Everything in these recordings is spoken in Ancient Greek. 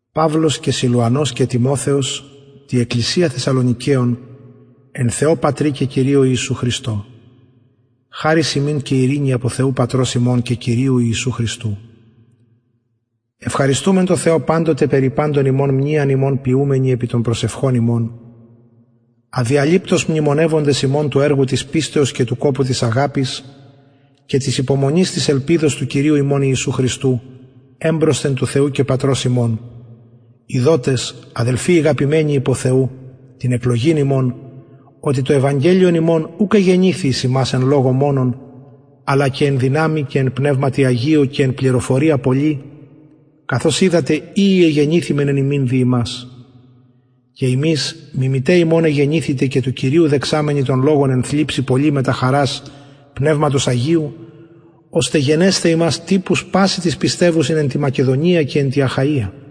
παυλος και σιλουανος και τιμοθεος τη εκκλησια θεσσαλονικεων εν θεω πατρι και κυριω ιησου χριστω χαρις υμιν και ειρηνη απο θεου πατρος ημων και κυριου ιησου χριστου ευχαριστουμεν τω θεω παντοτε περι παντων υμων μνειαν υμων ποιουμενοι επι των προσευχων ημων αδιαλειπτως μνημονευοντες υμων του εργου της πιστεως και του κοπου της αγαπης και της υπομονης της ελπιδος του κυριου ημων ιησου χριστου εμπροσθεν του θεου και πατρος ημων ειδοτες αδελφοι ηγαπημενοι υπο θεου την εκλογην υμων οτι το ευαγγελιον ημων ουκ εγενηθη εις υμας εν λογω μονον αλλα και εν δυναμει και εν πνευματι αγιω και εν πληροφορια πολλη καθως οιδατε οιοι εγενηθημεν εν υμιν δι υμας και υμεις μιμηται ημων εγενηθητε και του κυριου δεξαμενοι τον λογον εν θλιψει πολλη μετα χαρας πνευματος αγιου ωστε γενεσθαι υμας τυπους πασιν τοις πιστευουσιν εν τη μακεδονια και τη αχαια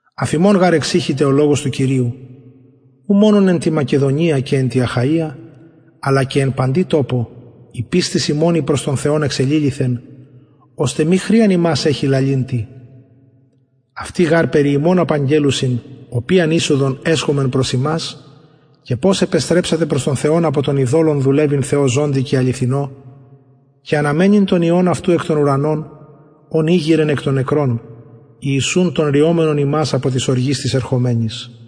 αφ υμων γαρ εξηχηται ο λογος του κυριου ου μονον εν τη μακεδονια και εν τη αχαια αλλα και εν παντι τοπω η πιστις υμων η προς τον θεον εξεληλυθεν ωστε μη χρειαν ημας εχειν λαλειν τι αυτοι γαρ περι ημων απαγγελλουσιν οποιαν εισοδον εσχομεν προς υμας και πως επεστρεψατε προς τον θεον απο των ειδωλων δουλευειν θεω ζωντι και αληθινω και αναμενειν τον υιον αυτου εκ των ουρανων ον ηγειρεν εκ των νεκρων ιησουν τον ρυομενον ημας απο της οργης της ερχομενης